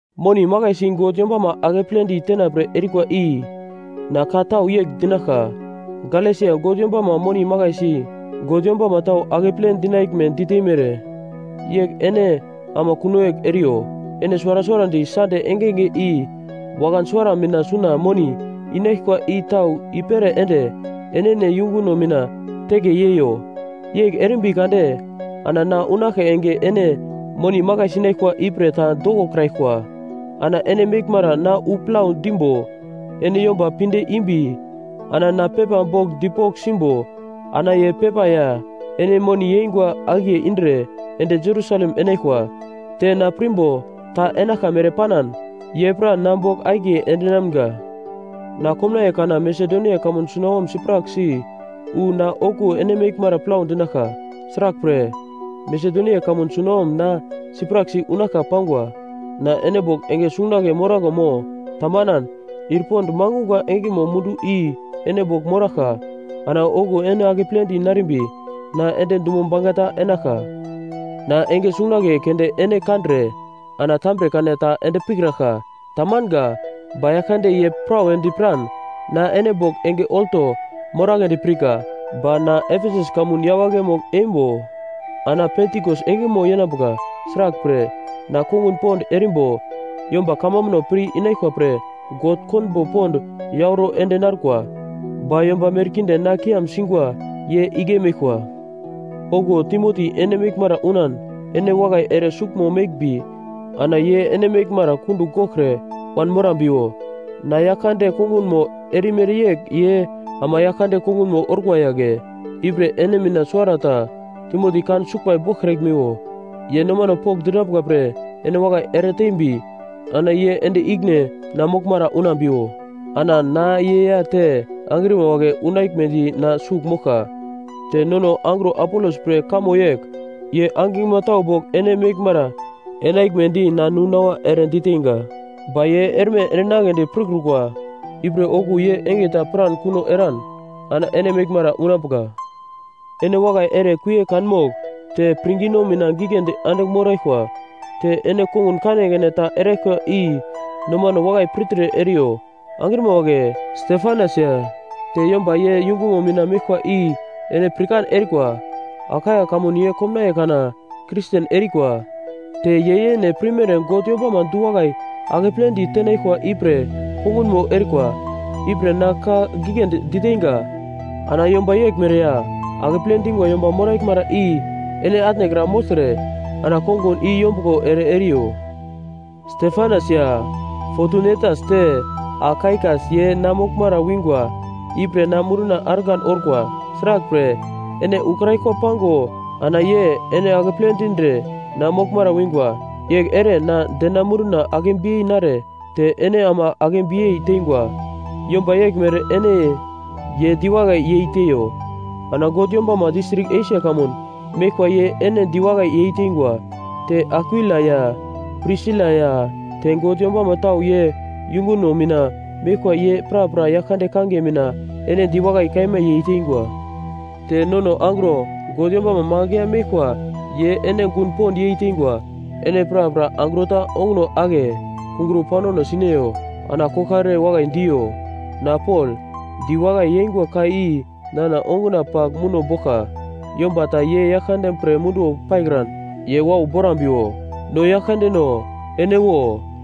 Moni makaisi God yombama akepledi tenapre erikwa i na ka tau yegl dinaglka. Galesia God yombama moni makaisi God yombama tau akeple dinaglme diteimere yegl ene ama kuno yegl eriyo. Ene suwara suwarandi Sande engenge i wakan suwara mina suna moni inaglkwa i tau i-pere ende enene yunguno mina teke yeiyo. Yegl erimbi kade ana na unaglka enge ene moni makai sinaglkwa ipre ta dokokraglkwa. Ana ene meglmara na wu plau dimbo ene yomba pinde imbi ana na pepa bogl dipogl simbo, ana ye pepa ya ene moni yeingwa akiye indre ende Jerusalem enaglkwa. Te na pirmbo ta enaglka mere panan, ye pra na bogl akiye endinamga. Na komnaiye kana Masedonia kamun sunawom sipraksi wu ana okuwo ene meglmara plau dinaglka. Sraglpre, Masedonia kamun sunawom na sipraksi unaglka pangwa. Na ene bogl enge sungunagle moraglo mo, tamanan, ir pond mangungwa engemo mundu i ene bogl moraglka. Ana okuwo ene akepledi narimbi na ende dumo bangeta enaglka. Na enge sungunagle keunde ene kandre ana tambre kana ta ende pikraglka. Tamanga. Ba Yaglkande ye prawedi piran na ene bogl enge olto moragledi pirka. Ba na Efesus kamun yawagle mogl-eimbo ana Pentikos engemo yenambuka. Sraglpre, na kongun pond erimbo yomba kamambuno pir-inaglkwa pre God konbo pond yauro ende narkwa. Ba yomba merkinde na kiam singwa ye igle meglkwa. Okuwo Timoti ene meglmara unan ene wakai ere suglmo meglmbi ana ye ene meglmara kundugl goglkre wanmorambiwo. Na Yaglkande kongunmo erimere yegl ye ama Yaglkande kongunmo orkwa yagle. Ipre ene mina suwarata Timoti kan suglbai boglkraglmiwo. Ye nomano pokndinambuka pre ene wakai eretembi ana ye ende ikine na moglmara unambiwo. Ana na ye ya te angrima wagle unaglmedi na sugl moglka. Te nono angro Apolos pre kamo yegl: Ye angiglma tau bogl ene meglmara enaglmedi na nu-nawa ere diteinga. Ba ye erme endinagledi pirkrukwa. Ipre okuwo ye enge ta piran kuno eran ana ene meglmara unambuka. Ene wakai ere kuie kanmogl te pirngino mina giglendi andigl moraglkwa. Te ene kongun kanekane ta eraglkwa i nomano wakai pirtre eriyo. Angrima wagle, Stefanas ya te yomba ye yungumo mina meglkwa i ene pirkan erikwa. Akaia kamun ye komnaiye kana Kristen erikwa. Te ye yene pirmere God yombama du-wakai akepledi tenaglkwa ipre kongunmo erikwa. Ipre na ka giglendi diteinga. Ana yomba yeglmere ya akeple dingwa yomba moraglmara i ene atnekra mogltre ana kongun i yombuglo ere eriyo. Stefanas ya Fotunetas te Akaikas ye na moglmara wingwa ipre na munduna argan orkwa. Sraglpre, ene ukraglkwa pango ana ye ene akeple dindre na moglmara wingwa. Yegl ere na dena munduna akebiyei nare te ene ama akebiyei teingwa. Yomba yeglmere ene ye diwakai yei teiyo. Ana God yombama distrik Esia kamun meglkwa ye ene diwakai yeiteingwa. Te Akwila ya Prisila ya te God yombama tau ye yunguno mina meglkwa ye prapra Yaglkande kangiye mina ene diwakai kaima yeiteingwa. Te nono angro God yombama magl ya meglkwa ye ene gun pond yeiteingwa. Ene prapra angro ta onguno ake kungro paunano sineyo ana koglkare wakai diyo. Na Pol, diwakai yeingwa ka i nana onguna pagl muno boglka. Yomba ta ye Yaglkande pre munduwo paikran ye wau borambiwo. No Yaglkandeno, ene wo!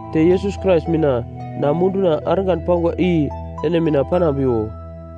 Te Yesus Krais mina na munduna argan pangwa i ene mina panambiwo.